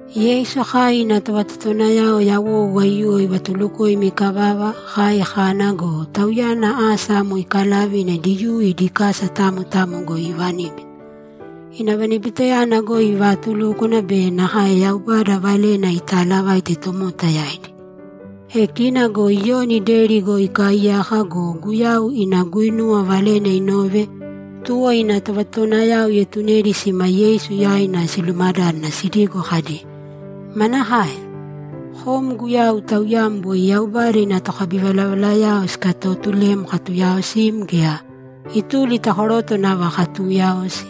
Yeisu kai ina tovatotowanayao yawou aiyuwo ivatulukoima ikavava, kai kana go, Tauyana asa amo ikalave ina Diyuu idi kasa tamo tamo goi iivaníbita. Ina vanibitayana goi ivaatulúkwana be nakae Yaubada Valena itaalavaite tomota yaidi. E kina go Iyoni deri goi ikaaiyaka go, Guyau ina guinuwa valena inove, tuwo ina tovatotowanayao ietunedi sima Yeisu yaina silumadádana sidigo kadi, ‘Manakae? Kom Guyau Tauyam boi Yaubada ina tokabivalavalayao sikatotulem katuyaosim gea, ituli ta koroto nava katuuyaosi?’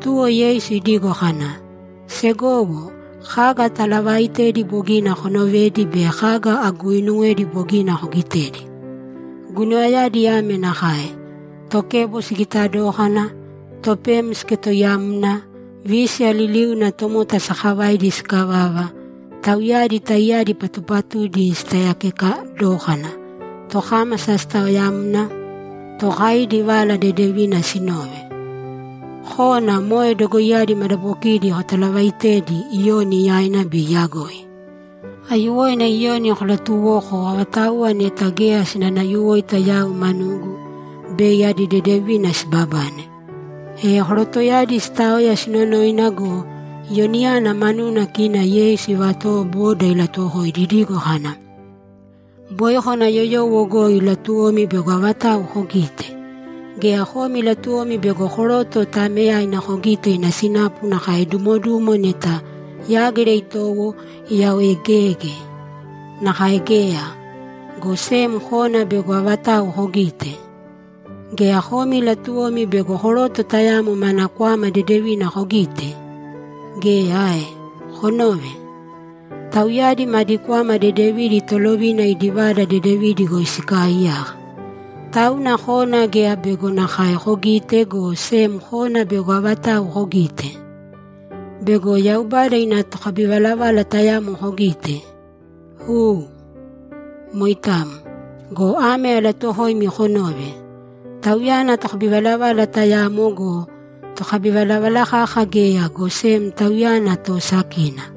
Tuwo Yeisu idigo kana, ‘Segowo, kaga atalavaaitedi bogina konovedi be kaga aguuinuwedi bogina kogitedi. Guinuwayadi ame nakae: Tokebo sigita dókana, topem siketoiyamna, vísiya liliuna tomota sakavaidi sikavava, tauyadi taiyadi patupatudi sitaiyakeka dókana, tokámasa sitaoyamna, tookaidi Vala Dedevina sinove. Kōna moe dogoiyadi madabokidi kotalavaitēdi Iyoni yaina bei iyagoi. Aiyuwoina Iyoni kolatuwōko avatauwa neta geya sinanayuwoita yau manugu, bei adi dedevina sibabane.’ E korotoyadi sitaoya sinonoina go, Iyoniyana manuna kina Yeisu ivatowo boda ilatuwokoidi idigo kana, ‘Boi kona yoyowo goi latuwomi bego avatau kogite? Gea, komi latuwomi bego koroto taameyaina kogite ina sinapu nakae dumodumo neta yágira itowo, iyaoegeege? Nakae geya, go sem kona bego avatau kogite? Gea, komi latuwomi bego koroto tayamo mana kwama dedevina kogite? Geya ae? Konōve. Tauyadi madi kwama dedevidi tolovina idi vada dedevidi goi sikaaiyaka. Tauna kona geya bego nakae kogite, go sem kona bego avatau kogite? Bego Yaubada ina tokabivalavala tayamo kogite? U, moitamo. Go ame alatuuwokoimi konōve: Tauyana tokabivalavala tayamo go, tokabivalavala kaka geya, go sem tauyana toosakina.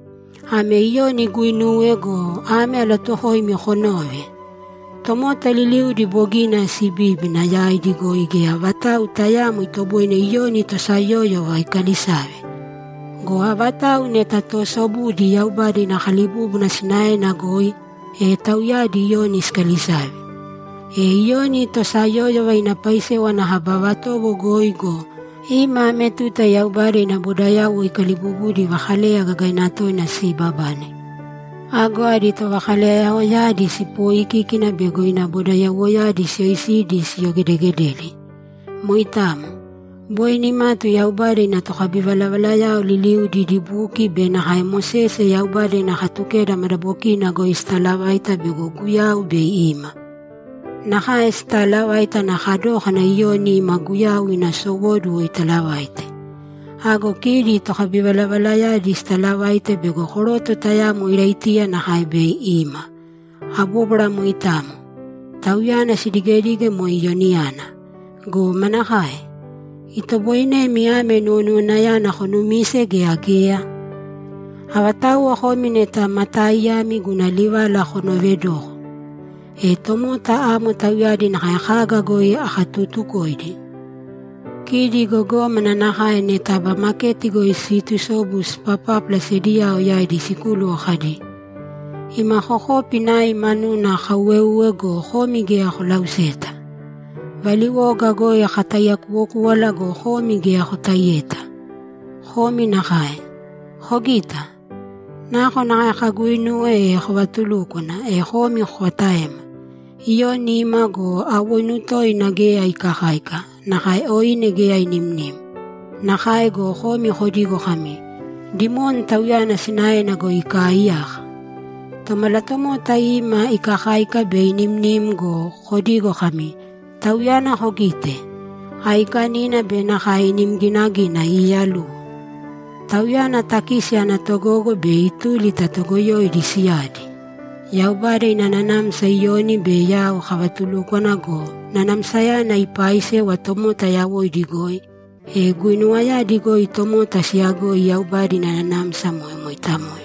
Ame Iyoni iguinuwe go, ame alatuuwokoimi konōve: Tomota liliudi bogina sibíbina, yaidi goi geya vatau tayaamo itoboine Iyoni tosayóyova ikalisave. Go avatauwa neta toosobudi Yaubada ina kalibúbuna sinaena goi, e tauyadi Iyoni sikalisave. E Iyoni tosayóyova ina paisewa ana kaba vatowo goi go, ima ame tuta Yaubada ina bodayauwo ikaliibubudi vakaleya gagaina toina siibabane. Ago adi tovakaleyayaoyadi sipoikíkina bego ina bodayauwoyadi siyoisidi siyogedegededi. Moitamo. Boi nimatu Yaubada ina tokabivalavalayao liliudi idi buki be nakae Mosese Yaubada ina Katukeda madabokina goi sitalavaita bego Guyau bei ima. Nakae sitaalavaite ana kadókana Iyoni ima Guyau ina sowóduwo italavaite. Ago kidi tokabivalavalayadi sitalavaite bego koroto tayamo Iraitiya nakae bei ima. Abóbwara moitamo, tauyana sidigedige moe Iyoniyana. Go manakae? Itoboinemi ame nuwonuwanayana konumise gea geya? Avatauwa komi neta ma taaiyami, guna livala konoovedōko. E tomota amo tauyadi nakae kaga goi akatutukoidi? Kidi gogómana nakae neta aba maketi goi siitusobu sipapápala sediyao yaidi sikúluwo kadi, “Ima kokopi nai manuna kauweuwe go, komi geya kolauseta. Valiwoga goi kataiyakuwokúwala go, komi geya kotaiyeta.” Komi nakae. Kogita? Nakonakae kaguinuwe o kavatulúkwana, e komi kokataema. Iyoni ima go, awoinu toina geya ikakáika, nakae oine geya inimnim. Nakae go, komi kodigo kami, “Dimoni tauyana sinaena goi ikaaiyaka!” Tomalatomota ima ikakáika be inimnim go, kodigo kami, “Tauyana kogite? Aikanina be nakae inim ginagina iiyaluwo. Tauyana takisi ana togogo be ituli ta toogoyoidi siyadi!” Yaubada ina nanamsa Iyoni be yau kavatulúkwana go, nanamsayana ipaaisewa tomota yawoidi goi, e guinuwayadi goi tomota siyagoi Yaubada ina nanamsa moe moitamo.’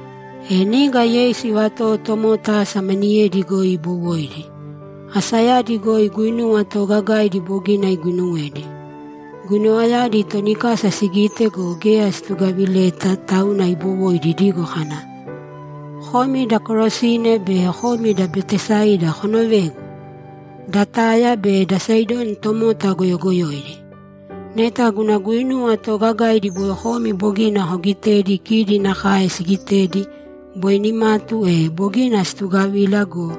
E niga Yeisu ivatowo tomota asa maniyedi goi ibowoidi. Asayadi goi guinuwa toogagaidi bogina iguinuwedi. Guinuwayadi toni kasa sigitedi go, geya situgavileta, tauna ibowoidi idigo kana, ‘Komi da Korasini be komi da Betesaida konovēgu! Da Taya be da Saidoni tomota goyogoyoidi. Neta guna guinuwa toogagaidi boi komi bogina koogitedi kidi nakae sigitedi, boi nimatu e, bogina situgavila go,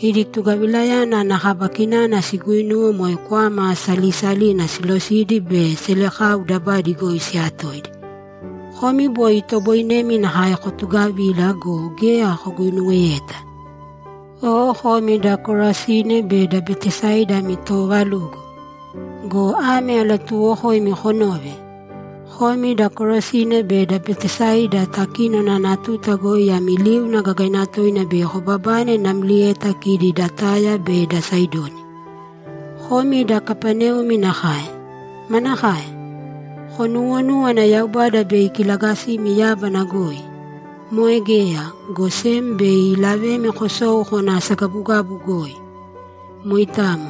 idi tugavilayana ana kaba kinana siguinuwe moe kwama salisalina silosidi be selekau dabadi goi siyatoidi. Komi boi itoboinemi nakae kotugavila go, geya koguinuweyeta. O komi da Korasini be da Betesaida ami toovalugo! Go ame alatuuwokoimi konōve: Komi da Korasini be da Betesaida takínona ana tuta goi ami liuna gagaina toina bei kobabane namlieta kidi da Taya be da Saidoni. Komi da Kapaneumi nakae. Manakae? Konuwonúwana Yaubada bei ikilagasimi yábana goi? Moe geya, go sem bei ilavemi kosou kona asagabugabu goi! Moitamo.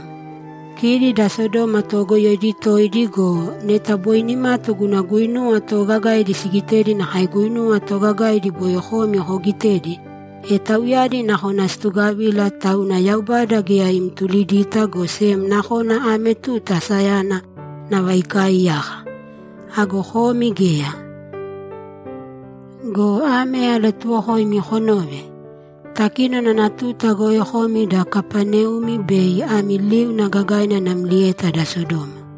Kidi da Sodoma toogoyoidi toidi go, neta boi nimatu guna guinuwa toogagaidi sigitedi nakae guinuwa toogagaidi boi komi kogitedi, e tauyadi nakona situgavila, tauna Yaubada geya imtulidita, go sem nakona ame tuta asayana nava ikaaiyaka. Ago komi geya. Go ame alatuuwokoimi konōve: Takínona ana tuta goi komi da Kapaneumi bei ami liuna gagaina namlieta da Sodoma.’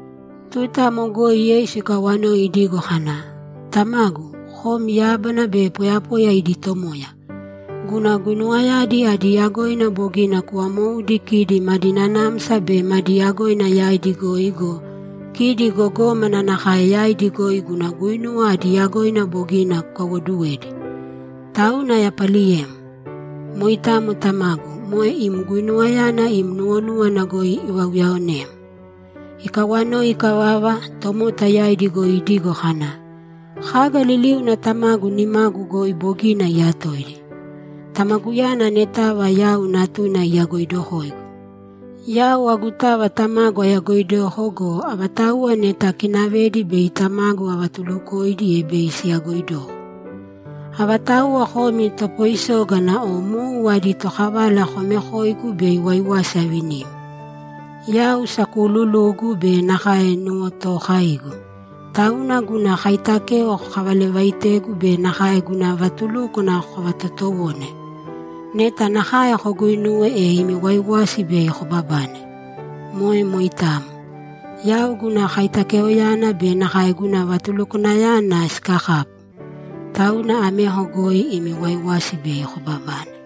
Tuta amo goi Yeisu ikawanoi idigo kana, ‘Tamagu, kom yábana be poyapoya idi Tomoya. Guna guinuwayadi adi yagoina bogina kuvamoudi kidi madi nanamsa be madi yagoina yaidi goi go, kidi gogómana nakae yaidi goi guna guinuwa adi yagoina bogina kukaiwoduwedi. Tauna ayapaliyem. Moitamo Tamagu, moe im guinuwayana im nuwonúwana goi ivauyaonem.’ Ikawanoi ikavava, tomota yaidi goi idigo kana, ‘Kaga liliuna Tamagu nimagu goi bogina iyatoidi. Tamaguyana anetava yau Natuna iyagoidokoigu. Yau agutava Tamagu ayagoidoko go, avatauwa neta akinavedi bei Tamagu avatulukoidi, e bei siyagoidoko. Avatauwa komi topoisógana o mou adi tokavala, komekōigu bei waiwasi avinimi. Yau sakuululugu be nakae nuwotookaigu, tauna guna kaitakeo kokavalavaitēgu be nakae guna vatulúkwana kovatotowōne. Neta nakae koguinuwe, e imi waiwasi bei kobabane. Moe moitamo. Yau guna kaitakeoyana be nakae guna vatulukwanayana sikakapu. Tauna ameko goi imi waiwasi bei kobabane.’